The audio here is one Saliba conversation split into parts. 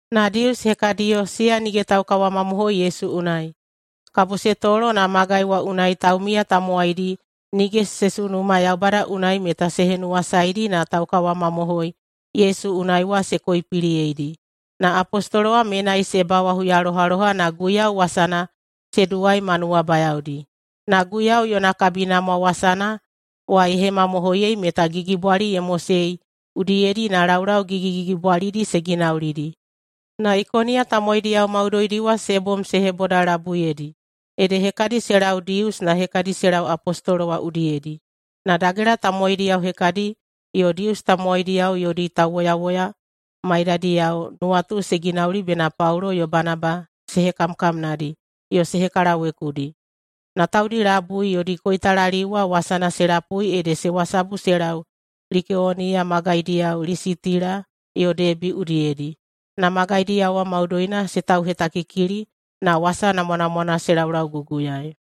Na Dius hekadiyo, siya nige taukawamamohoi Yesu unai, kabo se tolo na magai wa unai taumiya tamowaidi nige se sunuma Yaubada unai meta se henuwasaedi na taukawamamohoi Yesu unai wa se koipiliyeidi. Na apostolo wa menai se bawa huyalohaloha na Guiyau wasana se duwai ma nuwabayaodi. Na Guiyau yona kabinamwa wasana wa ye hemamohoiyei meta gigibwali ye mosei udiyedi na laulau gigigigibwalidi se ginaulidi. Na Ikoniya tamowaidiyao maudoidi wa se bom se hebodalabuiyedi, ede hekadi se lau Dius na hekadi se lau apostolo wa udiyedi. Na dagela tamowaidiyao hekadi yo Dius tamowaidiyao yodi tauwoyawoya maiyadiyao nuwatu se ginauli bena Paulo yo Banaba se hekamkamnadi yo se hekalawekudi. Na taudi labui yodi koitalaliu wa wasana se lapui ede se wasabu se lau Likeoniya magaidiyao Lisitila yo Debi udiyedi. Na magaidiyao wa maudoina se tauhetakikili na wasa namwanamwana se laulauguguyaei.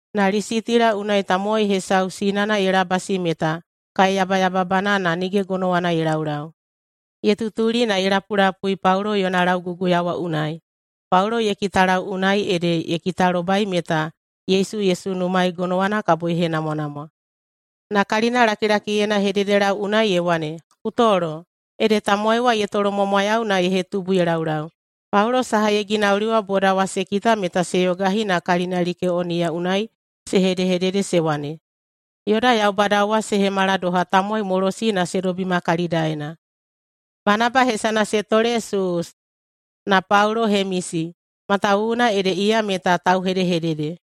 Na Lisitila unai tamowai hesau sinana ye labasi meta kaeyabayababana na nige gonowana ye laulau. Ye tutuli na ye lapulapui Paulo yona lauguguya wa unai. Paulo ye kitalau unai ede ye kitalobai meta Yesu ye sunumaei gonowana kabo ye henamwanamwa. Na kalinalakilakiyena ye hededelau unai ye wane, “Ku tolo!” Ede tamowai wa ye tolomwamwayau na ye hetubu ye laulau. Paulo saha ye ginauli wa boda wa se kita meta se yogahi na kalina Likeoniya unai se hedehedede se wane, “Yoda yaubadao wa se hemala doha tamowaimolosi na se dobima kalidaena!” Banaba hesana se tole Suus, na Paulo Hemesi, matawuwuna ede iya meta tauhedehedede.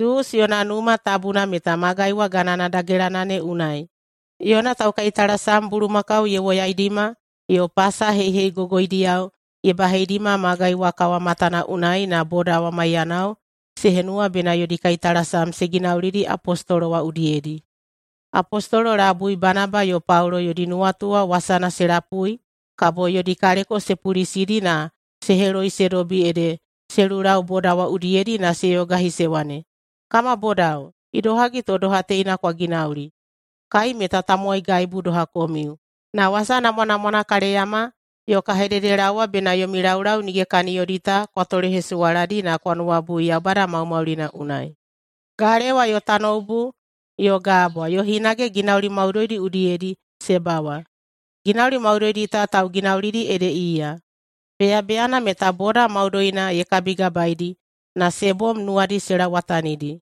Suus yona numa tabuna meta magai wa ganana dagelana ne unai. Yona taukaitalasam bulumakau ye woyaidima yo pasa heiheigogoidiyao ye baheidima magai wa kawamatana unai na boda wa maiyanao se henuwa bena yodi kaitalasam se ginaulidi apostolo wa udiyedi. Apostolo labui Banaba yo Paulo yodi nuwatu wa wasana se lapui kabo yodi kaleko se pulisidi na se heloi se dobi ede se lulau boda wa udiyedi na se yogahi se wane, “Kama bodao, idohagi to doha teina kwa ginauli? Kai meta tamowaigaibu doha komiu. Na wasa namwanamwana ka leyama yo ka hededelaowa bena yomi laulau nige kaniyodi ta kwa tolehesuwaladi na kwa nuwabui Yaubada maumaulina unai. Galewa yo tanoubu yo gabwa yo hinage ginauli maudoidi udiyedi se bawa, ginauli maudoidi ta tauginaulidi ede iya. Beyabeyana meta boda maudoina ye kabigabaedi na se bom nuwadi se lauwatanidi.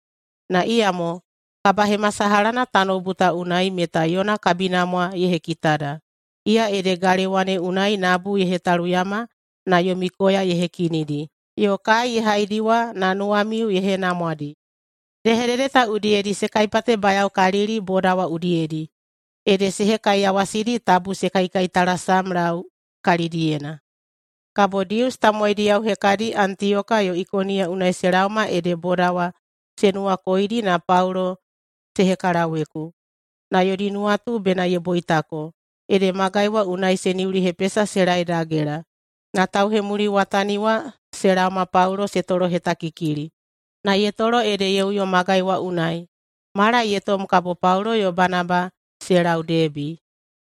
Na iyamo kabahemasalahana tanoubu ta unai, meta yona kabinamwa ye hekitada, iya ede galewa ne unai nabu ye hetaluyama na yomi koya ye hekinidi, yo kai ye haidiwa na nuwamiu ye henamwadi.” Hedehedede ta udiyedi se kaipatebayaokalili boda wa udiyedi, ede se hekaiyawasidi tabu se kaikaitalasamlau kalidiyena. Kabo Dius tamowaidiyao hekadi Antiyoka yo Ikoniya unai se laoma ede boda wa se nuwakoidi na Paulo se hekalaweku. Na yodi nuwatu bena ye boitako, ede magai wa unai se niulihepesa se lae dagela. Na tauhemuliwatani wa se laoma Paulo se tolohetakikili, na ye tolo ede ye uyo magai wa unai. Mala ye tom kabo Paulo yo Banaba se lau Debi.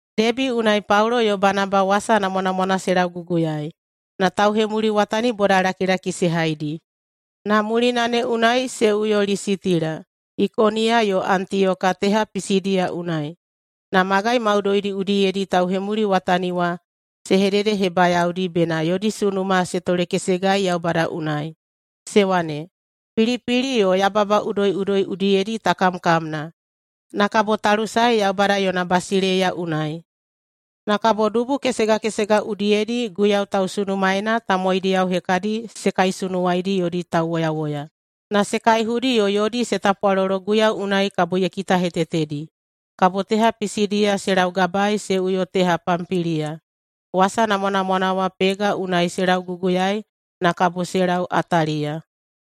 Debi unai Paulo yo Banaba wasa namwanamwana se lauguguyaei, na tauhemuliwatani bodalakilaki se haidi. Na mulina ne unai se uyo Lisitila, Ikoniya yo Antiyoka teha Pisidiya unai na magai maudoidi udiyedi tauhemuliwatani wa se hededehebayaodi bena yodi sunuma se tolekesegai Yaubada unai, se wane, “Pilipili yo yababa udoiꞌudoi udiyedi ta kamkamna, na kabo ta lusae Yaubada yona basileiya unai.” Na kabo dubu kesega kesega udiyedi Guiyau tausunumaena tamowaidiyao hekadi se kaisunuwaidi yodi tauwoyawoya, na se kaihudi yo yodi se tapwalolo Guiyau unai kabo ye kitahetetedi. Kabo teha Pisidiya se laugabaei se uyo teha Pampiliya. Wasa namwanamwana wa Pega unai se lauguguyaei na kabo se lau Ataliya.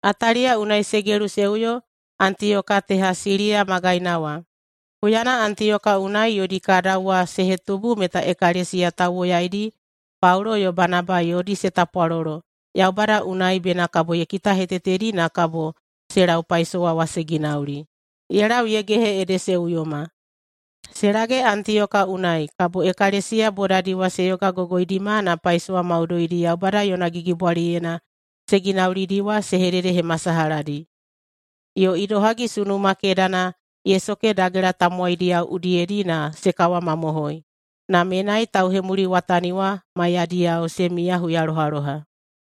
Ataliya unai se gelu se uyo Antiyoka teha Siliya magaina wa. Huyana Antiyoka unai yodi kadau wa se hetubu meta ekalesiya tauwoyaidi Paulo yo Banaba yodi se tapwalolo Yaubada unai bena kabo ye kitahetetedi na kabo se lau paisowa wa se ginauli, ye lau ye gehe ede se uyoma. Se lage Antiyoka unai, kabo ekalesiya bodadi wa se yogagogoidima na paisowa maudoidi Yaubada yona gigibwaliyena se ginaulidi wa se hededehemasalahadi, yo idohagi sunuma kedana ye soke dagela tamowaidiyao udiyedi na se kawamamohoi. Na menai tauhemuliwatani wa maiyadiyao se miya huyalohaloha.